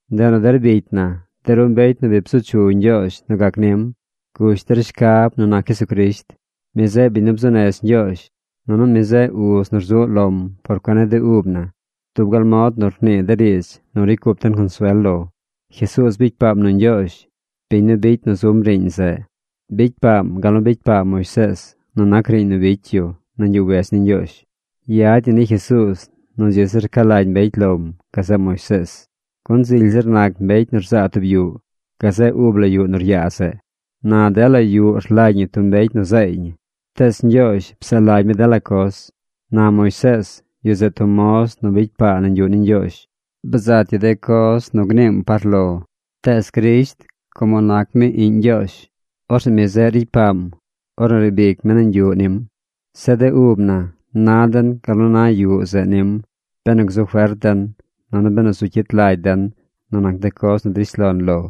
Ndeꞌ nu der bicy na, de ru mbecy nu bi bzu chu Ñgyoozh nu gac nim, gush der shcab nu nac Jesucrisht. Mi zeꞌ biñ nu bzuu nez Ñgyoozh, nunu mi zeꞌ uz nu rzuꞌ lom por cuen ni de ub na dub gal mod nu rnii de riidz nu ricy cup den consuel lo. Jesuuz bicy paam nu Ñgyoozh, biñ nu bicy nu zum riiñ zeꞌ. Bicy paam gal nu bicy paa Moisees nu nac riiñ nu bicy yu nañ yuꞌ wedz ni Ñgyoozh. Yad ñi ni Jesuuz nu dzi zir ca lagy mbecy lom gazeꞌ Moisees, gun zily zir nac mbecy nu rzaa tub yuꞌ gazeꞌ ub la yuꞌ nu ryaa zeꞌ. Na dela yuꞌ rlagy ñi tub mbecy nu zaay ñi. Tees Ñgyoozh psaꞌ lagy mi dela coz. Na Moisees, yu zeꞌ tub moz nu bicy paa nañ yuꞌ ni Ñgyoozh. Bzat yu de coz nu gniim par lo. Tees Crisht, como nac mi Iꞌñ Ñgyoozh, orzeꞌ mi zeꞌ ricy paam ornu riib ic mi nañ yuꞌ nim. Zeꞌ de ub na na den gal nu na yuꞌ zeꞌ nim benu gzu fert den, nunu benu zu cyit lagy den nu nac de coz nu drish lon lo.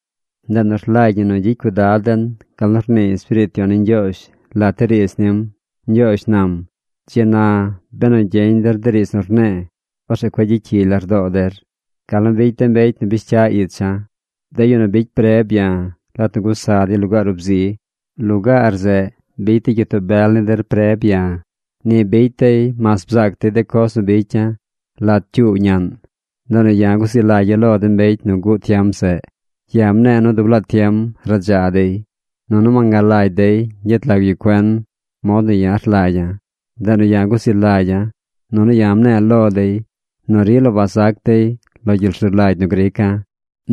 Ndeꞌ nu rlagy ñi nu gyicy cuidad den gal nu rnii Espiriit Yon ni Ñgyoozh lat de riidz nim. Ñgyoozh nam: Dzi na, benu gyeñ der de riidz nu rne̱e̱, Orzeꞌ cueꞌ gyicy cyigy lardoo der gal nu bicy de mbecy nu bish cya̱ icha̱, de yu nu bicy preb ya̱ lat nu gusa dey lugaar ub zi. Lugaar zeꞌ bicy de gyitoo bel ni der preb ya̱. Ni bicy dey mas bzaac dey de coz nu bicya̱ lat cyuu ñaꞌn. Ndeꞌ nu ya̱ guzi lagya̱ lo de mbecy nu guꞌ tiem zeꞌ. Ya̱ mne̱e̱ nu dub laa tiem radza dey. Nunu wangalagy dey ñgyet lag yu cuen mod nu ya̱ rlagya̱. Ndeꞌ nu ya̱ guzi lagya̱, nunu ya̱ mne̱e̱ lo dey nu rila wazac dey lo gyel rzu lagy nu grica̱,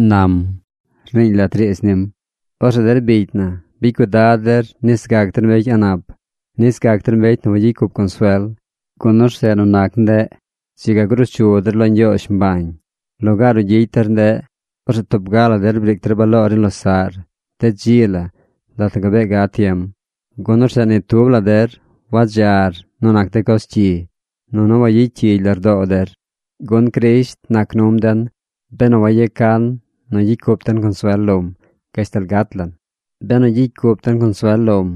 nam, rniiñ lat riidz nim. Orzeꞌ der bicy na, bicy cuidad der nis gac der mbecy a̱ꞌ nap, nis gac der mbecy nu wagyicy cup consuel, gun orzeꞌ nu nac ndeꞌ, dzi ga gruu chu der lo Ñgyoozh mbañ. Lugaar nu gyicy der ndeꞌ, orzeꞌ tub ga la der briic der baloor ni losaꞌr de dzi la lat nu gabee gad tiem, gun orzeꞌ ni tub la der wadzar nu nac de coz cyi, nunu wayacyigy lardoo der. Gun Crisht nac num den benu wayecan nu gyicy cup den consuel lom gashtal gat lan, benu gyicy cup den consuel lom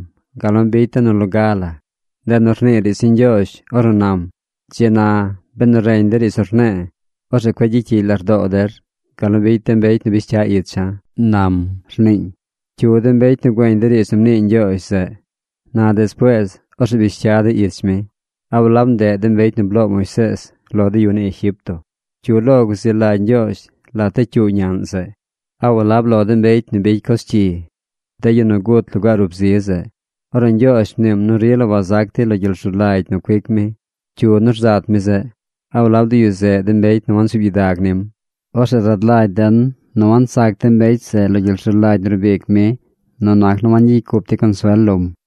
gal nu bicy den nu loga la. Ndeꞌ nu rnii riidz ni Ñgyoozh ornu nam: Dzi na, benu reñ der riidz nu rne̱e̱, orzeꞌ cueꞌ gyicy cyigy lardoo der gal nu bicy de mbecy nu bish cya icha̱, nam, rniiñ. ¿Cyu de mbecy nu güeñ de riidz nu mnii Ñgyoozh zeꞌ, na despuees orzeꞌ bish cya dey ich mi? ¿A walab ndeꞌ de mbecy nu bloo Moisees lo de yu ni Egipto? ¿Cyu lo guzi lagy Ñgyoozh lat de cyuu ñaꞌn zeꞌ? ¿A walab lo de mbecy nu bicy coz cyi, de yu nu gut lugaar ub zi zeꞌ? Ornu Ñgyoozh mniim nu rila wazac dey lo gyel rzu lagy nu cuic mi, ¿cyu nu rzat mi zeꞌ? ¿A walab de yu zeꞌ de mbecy nu wansuub gyidag nim? Orzeꞌ rad lagy den nu wansac de mbecy zeꞌ lo gyel rzu lagy nu rbic mi nu nac nu wangyicy cup dey consuel lom.